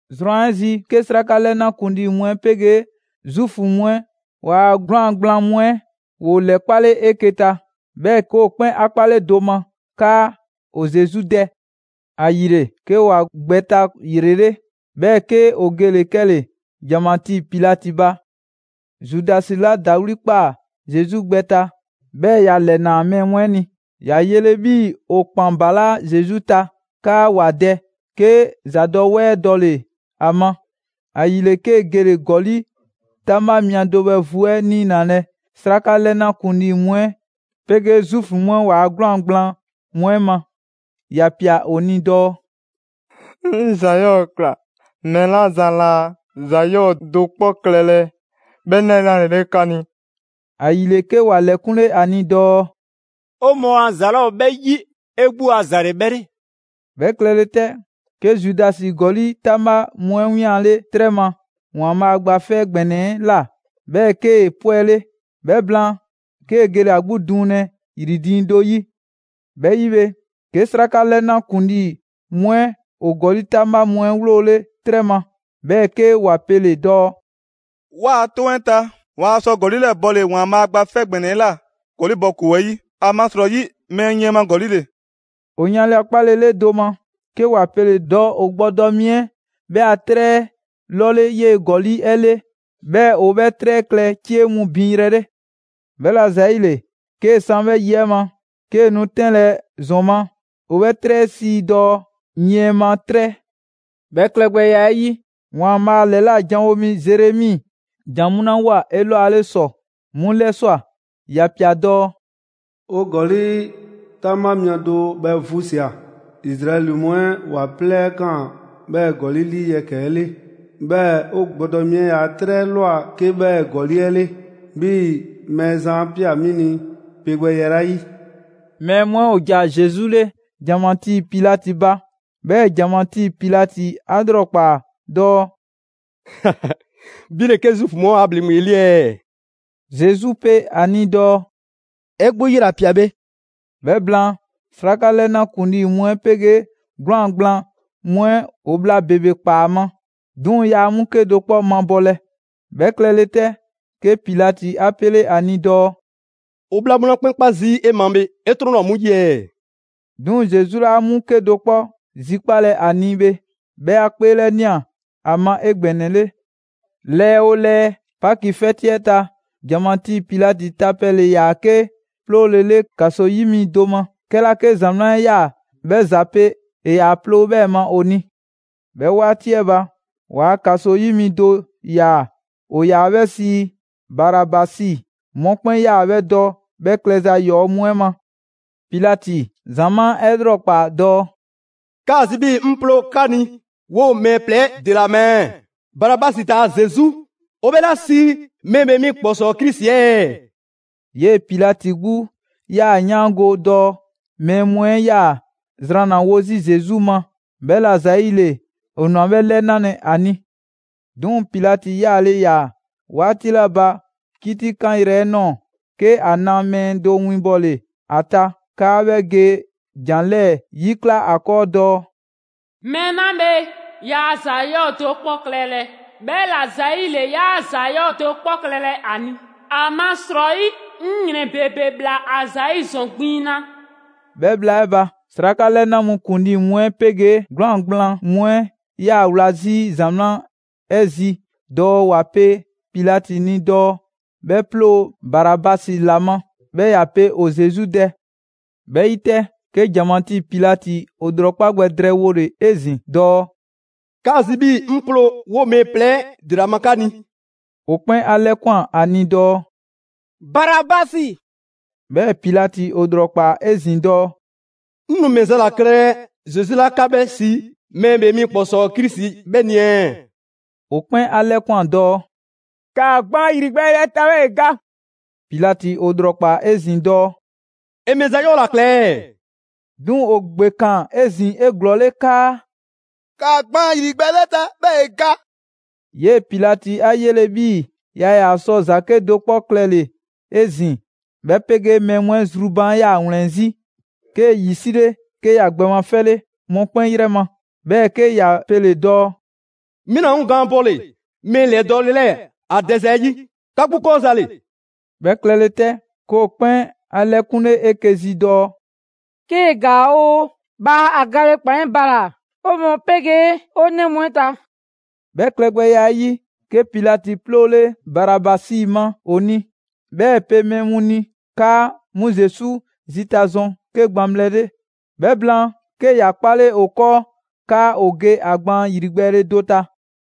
Zrwan 'ɛ zi, 'ke 'sraka 'lɛna ‑kuŋlii mu 'ɛ 'pegee Zuufu mu 'ɛ ‑waa' 'gwlaan‑ gblaan mu 'ɛ ‑woo ‑lɛkpale 'eke‑ ta, 'bhɛɛ‑ 'ke ‑o 'kpɛn 'a 'kpale do ma 'kaa ‑o Zesu dɛ. ‑Ayile, 'ke ‑wa gbɛ ta ‑yrele', 'bhɛɛ‑ 'ke ‑o gele‑ 'kɛle‑ ‑janmatii Pilati ba. Zudasi 'la ‑dawli' ꞊kpaa Zesu gbɛ ta, 'bhɛɛ‑ ‑ya ‑lɛnaa mɛɛ mu 'ɛ ni, 'a 'yele‑ 'bhii‑ ‑o ‑kpan ‑balaa' Zesu ta 'kaa ‑wa dɛ, 'ke ‑zadɔwɛɛ dɔle‑ ‑a ma. ‑Ayile, 'kee‑ gele‑ ‑gɔli' 'taŋbha mia do bhɛ vu 'ɛ 'niinalɛ 'sraka 'lɛna ‑kuŋlii mu 'ɛ 'pegee Zuufu mu 'ɛ ‑waa' 'gwlaan‑ gblaan mu 'ɛ ma. ‑Ya ꞊pia ‑o ni dɔɔ: «'Ŋ ‑za 'yɔɔ‑ ‑kla mɛɛ 'la zan laa ‑za 'yɔɔ‑ do 'kpɔ klɛlɛ 'bhɛ 'lɛnalele 'ka ni!» ‑Ayile, 'ke ‑wa ‑lɛkunle ‑a ni dɔɔ: «'O mɔɔ a za 'laa ‑o 'bhɛ 'yi, 'e 'gbu a ‑za ‑le 'bhɛ 'le.» 'Bhɛ klɛle 'tɛ, 'ke Zudasi ‑gɔli' 'taŋbha mu 'ɛ 'wianle 'trɛ ma ‑Waanbhaa' Gba 'Fɛ ‑Gbɛnɛ 'ɛ ꞊la, 'bhɛɛ‑ 'kee‑ 'pwɛle. 'Bhɛ blaan, 'kee‑ gele‑ ‑a 'gbu duŋlɛ ‑yri diiŋ do 'yi. 'Bhɛ 'yi bhe, 'ke 'sraka 'lɛna ‑kuŋlii mu 'ɛ ‑o ‑gɔli' 'taŋbha mu 'ɛ 'wloole 'trɛ ma, 'bhɛɛ‑ 'ke ‑wa pele‑ dɔɔ: «'Waa‑ 'toŋ 'ɛ ta, 'waa sɔ ‑gɔli' 'lɛɛ‑ bɔle‑ ‑Waanbhaa' Gba 'Fɛ ‑Gbɛnɛ 'ɛ ꞊la ‑gɔli' bɔ ‑koo 'ɛ 'yi, ‑amasrɔyi mɛɛ yiɛn ma ‑gɔli' ‑le.» ‑O yanle 'a 'kpalele do ma, 'ke ‑wa pele‑ dɔɔ ‑o gbɔdɔ mi 'ɛ 'bhɛ a 'trɛ 'ɛ 'lɔle 'yee‑ ‑gɔli' 'ɛ 'le, 'bhɛɛ‑ ‑o 'bhɛ 'trɛ 'ɛ klɛ 'cie mu binyrɛ 'le. 'Bhɛla‑ ‑zayile, 'kee‑ 'san 'bhɛ yi 'ɛ ma, 'kee‑ nu 'tɛnlɛ‑ ‑zɔn ma, ‑o 'bhɛ 'trɛ 'ɛ sii dɔɔ: «Yiɛn ma 'trɛ.» 'Bhɛ klɛgbɛya 'ɛ 'yi, ‑Waanbhaa' ‑lɛla' janwo mi Zeremi jan mu 'la ꞊woa 'elwale ‑sɔ 'mu 'lɛswa꞊, ‑ya ‑pia dɔɔ: «‑O ‑gɔli' 'taŋbha mia do bhɛ vu ꞊sia. Izraɛli mu 'ɛ ‑wa 'plɛɛ ꞊kaan 'bhɛɛ‑ ‑gɔli' 'lii yɛkɛ‑ 'ɛ 'le. 'Bhɛɛ‑ ‑o gbɔdɔ mi 'ɛ ‑yaa' 'trɛ 'ɛ ꞊lwa 'ke 'bhɛ ‑gɔli' 'ɛ 'le, 'bhii‑ Mɛɛzan 'a ꞊pia 'mi ni pe gbɛya 'la yi.» Mɛɛ mu 'ɛ ‑o ‑ja Zesu 'le ‑janmatii Pilati ba. 'Bhɛɛ‑ ‑janmatii Pilati 'a 'lrɔkpaa dɔɔ: «'Bhi ‑le 'ke Zuufu mu 'ɛ ‑waa' ‑bhleŋgbe 'ɛ 'le ɛɛ?» Zesu pe ‑a ni dɔɔ: «'E 'gbu 'yela‑ ꞊pia bhe.» 'Bhɛ blaan, 'sraka 'lɛna ‑kuŋlii mu 'ɛ 'pegee 'gwlaan‑ gblaan mu 'ɛ ‑o bhla ‑bebe ꞊kpaa ‑a ma, 'duŋ‑ yaa 'mu 'kedo‑ 'kpɔ mabɔlɛ. 'Bhɛ klɛle 'tɛ, 'ke Pilati 'a 'pele 'a ni dɔɔ: «‑O bhla mu 'la 'kpɛn 'kpa zii' 'e ma bhe 'e 'trɔn 'laa 'mu 'yi ɛɛ?» 'Duŋ‑ Zesu 'laa 'mu 'kedo‑ 'kpɔ zilakpalɛ ‑a ni bhe, 'bhɛ 'a 'kpeelɛnia ‑a ma 'egbɛnɛle. Lɛɛ 'oo lɛɛ, Paki 'fɛti 'ɛ ta, ‑janmatii Pilati ta pɛ ‑le ‑yaa 'ke 'ploolele ‑kaso yi mi do ma, 'kɛla 'ke ‑zamaa' 'ɛ 'yaa‑ 'bhɛ ‑za pe, ‑e 'yaa‑ ploo 'bhɛɛ‑ ma ‑o ni. 'Bhɛ 'waati 'ɛ ba, ‑waa' ‑kaso 'yi mi do ‑yaa, ‑o ‑yaa 'bhɛ sii Barabasi. Mɔkpɛn' 'yaa‑ 'bhɛ dɔ 'bhɛ klɛza ‑yɔɔ' mu 'ɛ ma. Pilati ‑zamaa' 'ɛ 'lrɔkpaa‑ dɔɔ: «'Kaa‑ zi 'bhii‑ 'ŋ 'ploo‑ 'ka ni 'woo‑ mɛɛ plɛ 'ɛ ‑dela ma ɛɛ, Barabasi taa‑ Zesu, ‑o 'bhɛ 'la sii Mɛɛ ‑Bhee mi ‑Kpɔsɔɔ Krisi ɛɛ?» 'Yee‑ Pilati 'gbu 'yaa‑ 'yaango‑ dɔɔ mɛɛ mu 'ɛ 'yaa‑ zranlawo zii' Zesu ma, 'bhɛla‑ ‑zayile ‑o ꞊nwa 'bhɛ ‑lɛnalɛ ‑a ni. 'Duŋ‑ Pilati 'yaale‑ ‑yaa 'waati 'la ba 'kitikanyrɛ 'ɛ ꞊nɔɔ, 'ke ‑a na mɛɛ do winbɔle ‑a ta 'kaa 'bhɛ ge ‑jan 'lɛɛ‑ 'yikla 'a ‑kɔɔ dɔɔ: «Mɛɛ 'la bhe, yaa ‑za 'yɔɔ‑ do 'kpɔ klɛlɛ, 'bhɛla‑ ‑zayile 'yaa ‑za 'yɔɔ‑ do 'kpɔ klɛlɛ ‑a ni, ‑amasrɔyi 'ŋ ‑yrɛn ‑bebe ‑bhla ‑a ‑zayi' ‑zɔn gbiŋ na.» 'Bhɛ bhla 'ɛ ba, 'sraka 'lɛna mu ‑kuŋlii mu 'ɛ 'pegee 'gwlaan‑ gblaan mu 'ɛ 'yaa‑ wla 'zi ‑zamaa' 'ɛ zi dɔɔ ‑wa pe Pilati ni dɔɔ 'bhɛ 'ploo‑ Barabasi ‑la ma, 'bhɛɛ‑ ‑ya pe ‑o Zesu dɛ. 'Bhɛ 'yi 'tɛ, 'ke ‑janmatii Pilati ‑o ‑lrɔkpa' gbɛ drɛɛwole 'ezin‑ dɔɔ: «'Kaa‑ zi 'bhii‑ 'ŋ 'ploo‑ 'woo‑ mɛɛ plɛ 'ɛ ‑dela ma 'ka ni?» ‑O 'kpɛn 'a 'lɛkwan‑ ‑a ni dɔɔ: «Barabasi!» 'Bhɛɛ‑ Pilati ‑o ‑lrɔkpaa 'ezin‑ dɔɔ: «'Ŋ nu ‑mɛ za ‑la klɛlɛ Zesu 'la 'ka 'bhɛ sii Mɛɛ ‑Bhee Mi ‑Kpɔsɔɔ Krisi 'bhɛ ni ɛɛ?» ‑O 'kpɛn 'a 'lɛkwan‑ dɔɔ: «‑Kaa gbaan ‑yrigbɛɛle 'ɛ ta, 'bhɛɛ‑ ‑e ga!» Pilati ‑o ‑lrɔkpaa 'ezin‑ dɔɔ: «‑E ‑mɛ ‑za 'yɔɔ‑ ‑la kla ɛɛ?» 'Duŋ‑ ‑o ‑gbekaan 'ezin‑ 'eglɔɔle 'kaa: «‑Kaa gbaan ‑yrigbɛɛle 'ɛ ta, 'bhɛɛ‑ ‑e ga!» 'Yee‑ Pilati 'a 'yele‑ 'bhii‑ yaa ‑yaa sɔ ‑za 'kedo‑ 'kpɔ klɛlɛ 'ezin‑, 'bhɛ 'pegee mɛɛ mu 'ɛ zru baan' 'yaa‑ ‑wlɛn 'zi, 'kee‑ ‑yi 'sile, 'ke ‑ya gbɛ mafɛle mɔkpɛn' 'yrɛ ma, 'bhɛɛ‑ 'ke ‑ya pele‑ dɔɔ: «'Mi 'naa ‑o 'ŋ gaan bɔle‑ mɛɛ ‑lɛdɔɔle 'lɛɛ‑ ‑a dɛza 'ɛ 'yi! 'Ka 'gbu 'kɔɔ za ‑le!» 'Bhɛ klɛle 'tɛ, 'ke ‑o 'kpɛn 'a 'lɛkunle 'eke‑ zi dɔɔ: «'Kee‑ ‑gaa oo, bhaa ‑a gale ‑kpan 'ɛ bala‑ 'o mɔɔ 'pegee 'o 'nɛ mu 'ɛ ta!» 'Bhɛ klɛgbɛya 'ɛ 'yi, 'ke Pilati 'ploole Barabasi ma ‑o ni; 'bhɛɛ‑ ‑e pe mɛɛ mu ni 'kaa 'mu Zesu zita zɔn 'ke gbaŋbhlɛ 'le; 'bhɛ blaan, 'ke ‑ya 'kpale ‑o 'kɔɔ 'kaa ‑o ge ‑a gbaan ‑yrigbɛɛle do ta.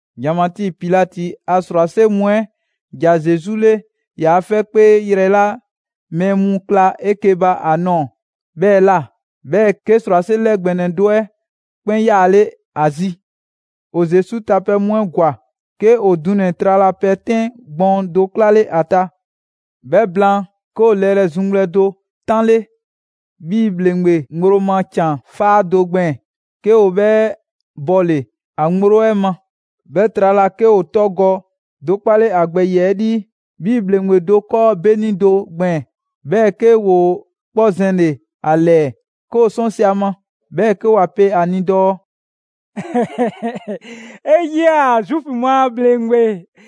‑Janmatii Pilati a ‑srwase' mu 'ɛ ‑ja Zesu 'le ‑yaa 'fɛkpee yrɛ 'la mɛɛ mu kla 'eke‑ ba a ꞊nɔɔ 'bhɛɛ‑ ꞊la; 'bhɛɛ‑ 'ke ‑srwase' 'lɛ ‑gbɛnɛ do 'ɛ 'kpɛn 'yaale ‑a zi. ‑O Zesu tapɛ mu 'ɛ ‑gwa, 'ke ‑o dunɛ‑ tralapɛ 'tɛn gbɔɔn do 'klale ‑a ta. 'Bhɛ blaan, 'ke ‑o lɛrɛ zuŋgbhlɛ do 'tanle 'bhii‑ ‑bhleŋgbe ŋgblo ma ‑can 'faa do gbɛɛn‑, 'ke ‑o 'bhɛ bɔle‑ ‑a ŋgblo 'ɛ ma. 'Bhɛ trala, 'ke ‑o togɔ do 'kpale ‑a gbɛ ‑yiɛ' 'lii 'bhii‑ ‑bhleŋgbe do 'kɔɔ 'beni do gbɛɛn‑; 'bhɛɛ‑ 'ke ‑woo 'kpɔ zɛnle‑ ‑a ‑lɛɛ, 'ke ‑o 'sɔnsi‑ 'a ma, 'bhɛɛ‑ 'ke ‑wa pe ‑a ni dɔɔ: «'E 'yia‑, Zuufu mu a ‑bhleŋgbe!»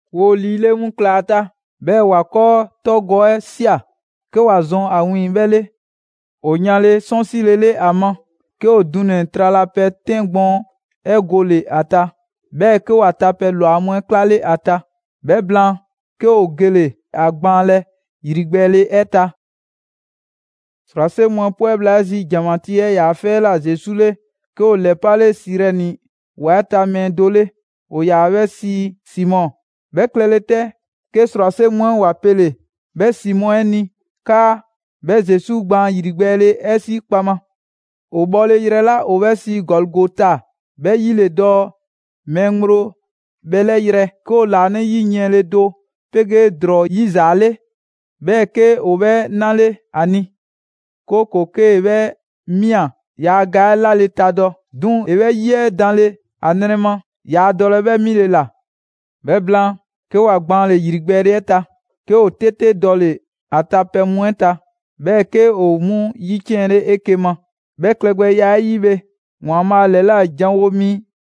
‑Woo ‑liile' mu ꞊klaa ‑a ta, 'bhɛɛ‑ ‑wa 'kɔɔ togɔ 'ɛ ꞊sia, 'ke ‑wa zɔn ‑a 'wiiŋ‑ 'bhɛ 'le. ‑O yanle 'sɔnsile 'le ‑a ma, 'ke ‑o dunɛ‑ tralapɛ 'tɛn gbɔɔn 'ɛ gole‑ ‑a ta, 'bhɛɛ‑ 'ke ‑wa tapɛ ‑lwa mu 'ɛ 'klale ‑a ta. 'Bhɛ blaan, 'ke ‑o gele‑ ‑a gbaanlɛ ‑yrigbɛɛle 'ɛ ta. ‑Srwase' mu 'ɛ 'pwɛ bhla 'ɛ zi ‑janmatii 'ɛ ‑yaa' 'fɛ 'ɛ ꞊la Zesu 'le, 'ke ‑o ‑lɛpale Sirɛni ‑wa 'ɛ ta mɛɛ do 'le, ‑o ‑yaa 'bhɛ sii Simɔ. 'Bhɛ klɛle 'tɛ, 'ke ‑srwase' mu 'ɛ ‑wa pele‑ 'bhɛ Simɔ 'ɛ ni 'kaa 'bhɛ Zesu gbaan ‑yrigbɛɛle 'ɛ 'si kpaŋma. ‑O bhɔle yrɛ 'la ‑o 'bhɛ sii Gɔligota ('bhɛ 'yi ‑le dɔɔ mɛɛ ŋgblo bhɛlɛ' yrɛ), 'ke ‑o ‑laanɛ' 'yi yiɛnle do 'pegee ‑drɔɔ 'yizaale, 'bhɛɛ‑ 'ke ‑o 'bhɛ 'nale 'a ni, ('kooko‑ 'kee‑ 'bhɛ ꞊mia, yaa ga 'ɛ 'lale‑ tadɔ). 'Duŋ‑ ‑e 'bhɛ ‑yi 'ɛ danle ‑a nrɛ ma, yaa dɔlɛ 'bhɛ 'mile‑ ‑la. 'Bhɛ blaan, 'ke ‑wa gbaanle‑ ‑yrigbɛɛle 'ɛ ta, 'ke ‑o 'tete dɔle‑ ‑a tapɛ mu 'ɛ ta, 'bhɛɛ‑ 'ke ‑o 'mu ‑yiciɛnle 'eke‑ ma. 'Bhɛ klɛgbɛya 'ɛ 'yi bhe, ‑Waanbhaa' ‑lɛla' janwo mi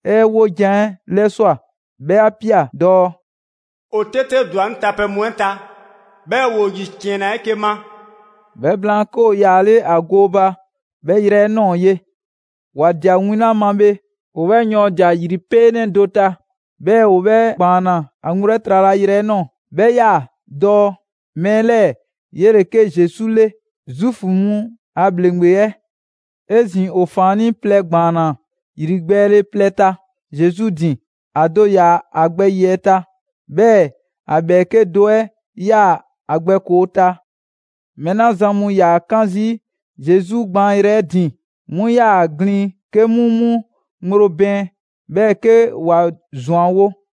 'ɛ 'wojan‑ 'ɛ 'lɛswa꞊, 'bhɛ 'a ꞊pia dɔɔ: «‑O 'tete ‑dwa 'ŋ tapɛ mu 'ɛ ta, 'bhɛɛ‑ ‑woo ‑yiciɛnna 'eke‑ ma.» 'Bhɛ blaan, 'ke ‑o ‑yaale' ‑a gooba 'bhɛ yrɛ 'ɛ ꞊nɔɔ ye. ‑Wa ꞊dia win 'la ma bhe, ‑o 'bhɛ ‑yɔɔndia ‑yripeenɛ do ta, 'bhɛɛ‑ ‑o 'bhɛ ‑gbaanna ‑a ŋgblo 'ɛ tralayrɛ 'ɛ ꞊nɔɔ, 'bhɛ 'yaa‑ dɔɔ: «Mɛɛ 'lɛɛ‑ 'yele‑ 'ke Zesu 'le, Zuufu mu a ‑bhleŋgbe 'ɛ.» 'Ezin‑, ‑o ‑faannii' plɛ ‑gbaanna ‑yrigbɛɛle plɛ ta Zesu ‑din: ‑A do ‑yaa ‑a gbɛ ‑yiɛ' ta, 'bhɛɛ‑ ‑a ‑bhɛɛke' do 'ɛ 'yaa‑ ‑a gbɛ ‑koo ta. Mɛɛ 'la zan mu ‑yaa 'kan zii' Zesu gbaanyrɛ 'ɛ ‑din, 'mu 'yaa‑ a glin 'ke 'mu 'mu ŋgblo bɛɛn, 'bhɛɛ‑ 'ke ‑wa ‑zwanwo'.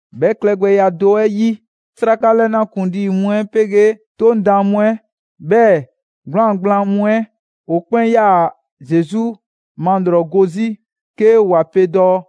'Bhɛ klɛgbɛya do 'ɛ 'yi, 'sraka 'lɛna ‑kuŋlii mu 'ɛ 'pegee 'Toŋ daan mu 'ɛ, 'bhɛɛ‑ 'gwlaan‑ gblaan mu 'ɛ, ‑o 'kpɛn 'yaa‑ Zesu malrɔgo 'zi 'ke ‑wa pe dɔɔ: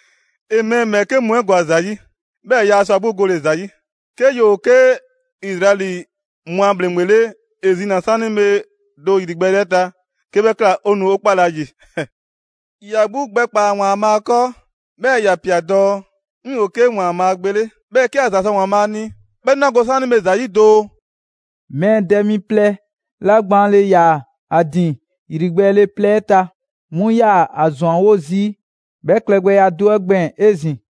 «‑E mɛɛ ‑bhɛɛke' mu 'ɛ ‑gwa ‑za 'yi, 'bhɛɛ‑ yaa sɔ ‑a 'gbu gole ‑za 'yi! 'Ke ‑yoo 'ke Izraɛli mu a ‑bhleŋgbe 'le, ‑e zina‑ 'saanibhe doo ‑yrigbɛɛle 'ɛ ta; 'kee‑ 'bhɛ ꞊kla, 'o nu 'o 'kpalɛ‑ ‑a ‑yi. ‑Ya 'gbu gbɛkpaa‑ ‑Waanbhaa' 'kɔɔ, 'bhɛɛ‑ ‑ya ‑pia dɔɔ: ‹'Ŋ 'yoo‑ 'ke ‑Waanbhaa' Gbe 'le!› 'Bhɛɛ‑ 'ke ‑a ‑za sɔ ‑Waanbhaa' ni 'bhɛ nu 'a go 'saanibhe ‑za 'yi doo!» Mɛɛ dɛ mi plɛ 'la gbaanle ‑yaa ‑a ‑din ‑yrigbɛɛle plɛ 'ɛ ta, 'mu 'yaa‑ ‑a ‑zwanwo' zii' 'bhɛ klɛgbɛya do 'ɛ gbɛɛn‑ 'ezin‑.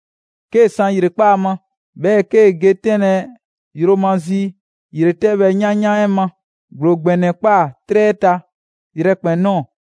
'Kee‑ san ‑yrekpaa' ma, 'bhɛɛ‑ 'kee‑ ge 'tɛnlɛ‑ yromazi ‑yretɛbhɛ yanyan 'ɛ ma, ‑gblo ‑gbɛnɛ ‑kpaa 'trɛ 'ɛ ta yrɛkpɛn‑ ꞊nɔɔ.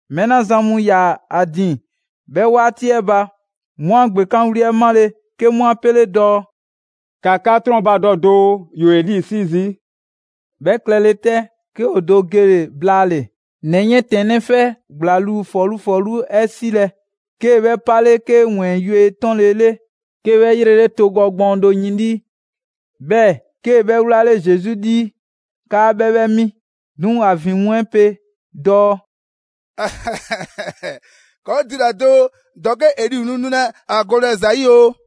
Mɛɛ 'la zan mu ‑yaa ‑a ‑din 'bhɛ 'waati 'ɛ ba, 'mu 'a ‑gbekanwli 'ɛ 'male, 'ke 'mu 'a pele‑ dɔɔ: «‑Ka 'ka 'trɔnbadɔ doo, ‑yoo Eli 'sii zii'!» 'Bhɛ klɛle 'tɛ, 'ke ‑o do gele blaale‑ ‑nɛ 'yiɛntɛnnɛ 'fɛ ‑gblaŋluu ‑fɔlu' ‑fɔlu' 'ɛ 'silɛ‑, 'kee‑ 'bhɛ 'pale 'ke ‑wɛɛn yue 'tɔnle‑ 'le. 'Kee‑ 'bhɛ 'yrele togɔ gbɔɔn do yin 'lii, 'bhɛɛ‑ 'kee‑ 'bhɛ 'wlale Zesu 'lii 'kaa 'bhɛ 'bhɛ 'mi. 'Duŋ‑ ‑a ‑vin mu 'ɛ pe dɔɔ: «'Kɔɔ‑ dula‑ doo, ‑dɔke' Eli nu nulɛ a golɛ ‑za 'yi oo!»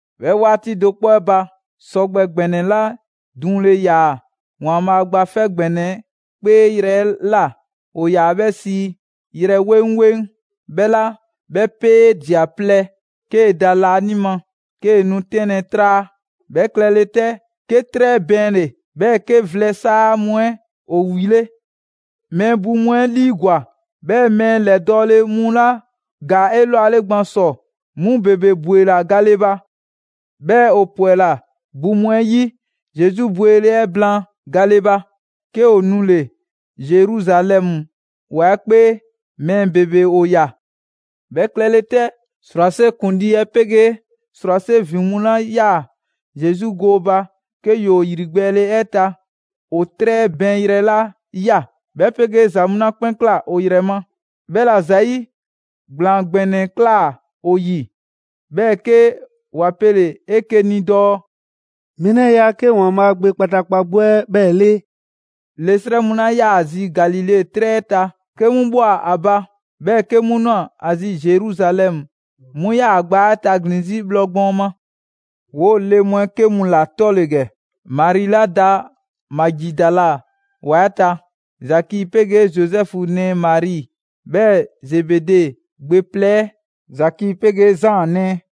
'Bhɛ 'waati do 'kpɔ 'ɛ ba, sɔgbɛ ‑gbɛnɛ 'la duŋle ‑yaa ‑Waanbhaa' Gba 'Fɛ ‑Gbɛnɛ 'ɛ 'kpee yrɛ 'la ‑o ‑yaa 'bhɛ sii «Yrɛ 'weŋ 'weŋ» 'bhɛ꞊la, 'bhɛ 'peedia‑ plɛ 'kee‑ da laanima, 'kee‑ nu 'tɛnlɛ‑ 'traa. 'Bhɛ klɛlɛ 'tɛ, 'ke 'trɛ bɛɛnle‑, 'bhɛɛ‑ 'ke vlɛ ‑saa mu 'ɛ ‑o ‑wile'. Mɛɛ bu mu 'ɛ 'liigwa‑, 'bhɛɛ‑ mɛɛ ‑lɛdɔɔle mu 'la ‑gaa 'elwale gban ‑sɔ, 'mu ‑bebe ‑bwela gale ba. 'Bhɛɛ‑ ‑o ‑pwɛla bu mu 'ɛ 'yi Zesu bwele 'ɛ blaan gale ba, 'ke ‑o nule‑ Zeruzalɛmu ‑wa 'ɛ 'kpee. Mɛɛ ‑bebe ‑o ꞊ya. 'Bhɛ klɛle 'tɛ, ‑srwase' ‑kuŋlii 'ɛ 'pegee ‑srwase' ‑vin mu 'la 'yaa‑ Zesu gooba 'ke ‑yoo ‑yrigbɛɛle 'ɛ ta, ‑o 'trɛ bɛɛnyrɛ 'la ꞊ya, 'bhɛ 'pegee ‑za mu 'la 'kpɛn ꞊kla ‑o ‑yrɛ ma, 'bhɛla‑ ‑zayi' ‑gblaan ‑gbɛnɛ ꞊klaa ‑o ‑yi. 'Bhɛɛ‑ 'ke ‑wa pele‑ 'eke‑ ni dɔɔ: «Mɛɛ 'lɛɛ‑ 'yaa‑ 'ke ‑Waanbhaa' Gbe kpataakpa 'gbu 'ɛ 'bhɛɛ‑ 'le!» Le 'srɛ mu 'la 'yaa‑ zi Galile 'trɛ 'ɛ ta 'ke 'mu bhɔ a ba, 'bhɛɛ‑ 'ke 'mu ꞊nwa ‑a zi Zeruzalɛmu, 'mu 'yaa‑ ‑a gbaa 'ɛ taglin‑ 'zi bhlɔ gbɔɔn ma. 'Woo‑ le mu 'ɛ 'ke mu ‑la 'tɔ ‑le ‑gɛ: Mari 'la da Magidala ‑wa 'ɛ ta, Zaki 'pegee Zozɛfu nɛɛ Mari, 'bhɛɛ‑ Zebede gbe plɛ 'ɛ Zaki 'pegee Zaan nɛɛ.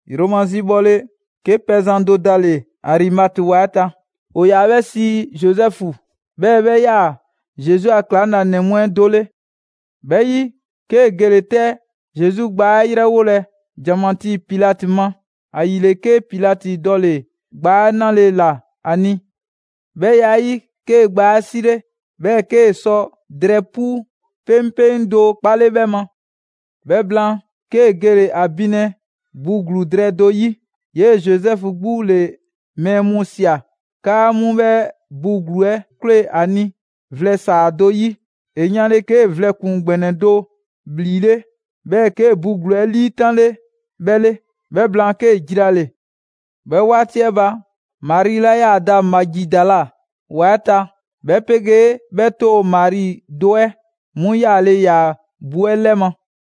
Yromazi bhɔle, 'ke pɛzan do dale‑ Arimate ‑wa 'ɛ ta, ‑o ‑yaa 'bhɛ sii Zozɛfu, 'bhɛɛ‑ 'bhɛ 'yaa‑ Zesu a ‑klaŋlanɛ mu 'ɛ do 'le. 'Bhɛ 'yi, 'kee‑ gele‑ 'tɛ Zesu gbaa 'ɛ 'yrɛwolɛ ‑janmatii Pilati ma. ‑Ayile, 'ke Pilati dɔle‑ gbaa 'ɛ 'nale‑ ‑la ‑a ni. 'Bhɛ ya 'ɛ 'yi, 'kee‑ gbaa 'ɛ 'sile, 'bhɛɛ‑ 'kee‑ sɔ drɛɛ 'pu 'peŋpeŋ do 'kpale 'bhɛ ma. 'Bhɛ blaan, 'kee‑ gele‑ ‑a binlɛ bu ‑gluu drɛɛ do 'yi. 'Yee‑ Zozɛfu 'gbu ‑le mɛɛ mu ꞊sia 'kaa 'mu 'bhɛ bu ‑gluu 'ɛ 'kwlee‑ ‑a ni vlɛ ‑saa do 'yi. ‑E yanle 'kee‑ vlɛ ‑kpuŋ ‑gbɛnɛ do ‑bhlile', 'bhɛɛ‑ 'kee‑ bu ‑gluu 'ɛ 'liitanle 'bhɛ 'le. 'Bhɛ blaan, 'kee‑ jilale. 'Bhɛ 'waati 'ɛ ba, Mari 'la 'yaa‑ da Magidala ‑wa 'ɛ ta, 'bhɛ 'pegee 'bhɛ 'too‑ Mari do 'ɛ, 'mu 'yaale ‑yaa bu 'ɛ 'lɛma‑.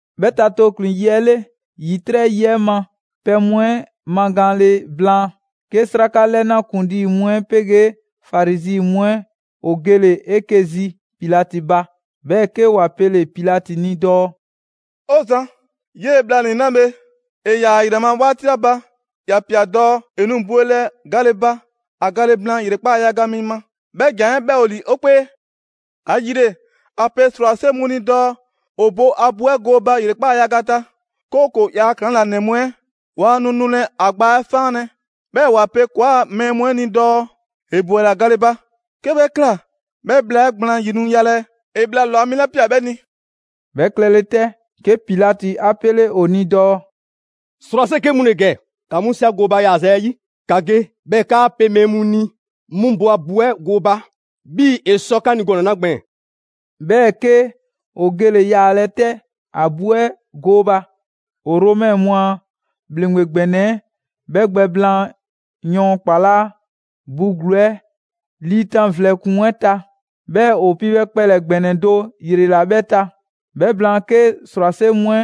'Bhɛ ta tooklin‑ 'ɛ 'yi 'le, ‑yitrɛ' yi 'ɛ ma pɛ mu 'ɛ magaanle blaan, 'ke 'sraka 'lɛna ‑kuŋlii mu 'ɛ 'pegee Farizi mu 'ɛ ‑o gele‑ 'eke‑ zi Pilati ba. 'Bhɛɛ‑ 'ke ‑wa pele‑ Pilati ni dɔɔ: «'O zan, 'yee‑ bhlanii‑ 'la bhe, ‑e ‑yaa ‑a ‑yrɛ ma 'waati 'la ba, ‑ya ꞊pia dɔɔ ‑e nu bwelɛ gale ba, ‑a gale blaan ‑yrekpaa' yaga mi ma. 'Bhɛ ‑jan 'ɛ 'bhɛ ‑o ‑li 'o 'kpee. ‑Ayile, ‑a pe ‑srwase' mu ni dɔɔ ‑o bo ‑a bu 'ɛ gooba ‑yrekpaa' yaga ta, 'kooko‑ ‑yaa' ‑klaŋlanɛ mu 'ɛ waa nu nulɛ ‑a gbaa 'ɛ 'faanlɛ‑, 'bhɛɛ‑ ‑wa pe ‑kɔɔa' mɛɛ mu 'ɛ ni dɔɔ: ‹‑E ‑bwela gale ba.› 'Ke 'bhɛ ꞊kla, 'bhɛ bhla 'ɛ gblaan 'yi nu yalɛ ‑e bhla ‑lwa mi 'la ꞊pia 'bhɛ ni.» 'Bhɛ klɛle 'tɛ, 'ke Pilati 'a 'pele ‑o ni dɔɔ: «‑Srwase' 'ke mu ‑le ‑gɛ, ‑ka mu 'si ‑a gooba yaaza 'yi. ‑Ka ge 'bhɛɛ‑ ‑kaa pe mɛɛ mu ni 'mu bo a bu 'ɛ gooba 'bhii‑ ‑e sɔ 'ka ni gɔnɛ‑ 'la gbɛɛn‑.» 'Bhɛɛ‑ 'ke ‑o gele‑ yaalɛ 'tɛ ‑a bu 'ɛ gooba. ‑O Romɛ mu a ‑bhleŋgbe ‑gbɛnɛ 'ɛ, 'bhɛ gbɛ blaan yɔɔn ‑kpalaa' bu ‑gluu 'ɛ 'liitan vlɛ ‑kpuŋ 'ɛ ta, 'bhɛɛ‑ ‑o piibhɛ kpɛlɛ‑ ‑gbɛnɛ do ‑yrela 'bhɛ ta. 'Bhɛ blaan, 'ke ‑srwase' mu 'ɛ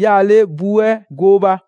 'yaale bu 'ɛ gooba.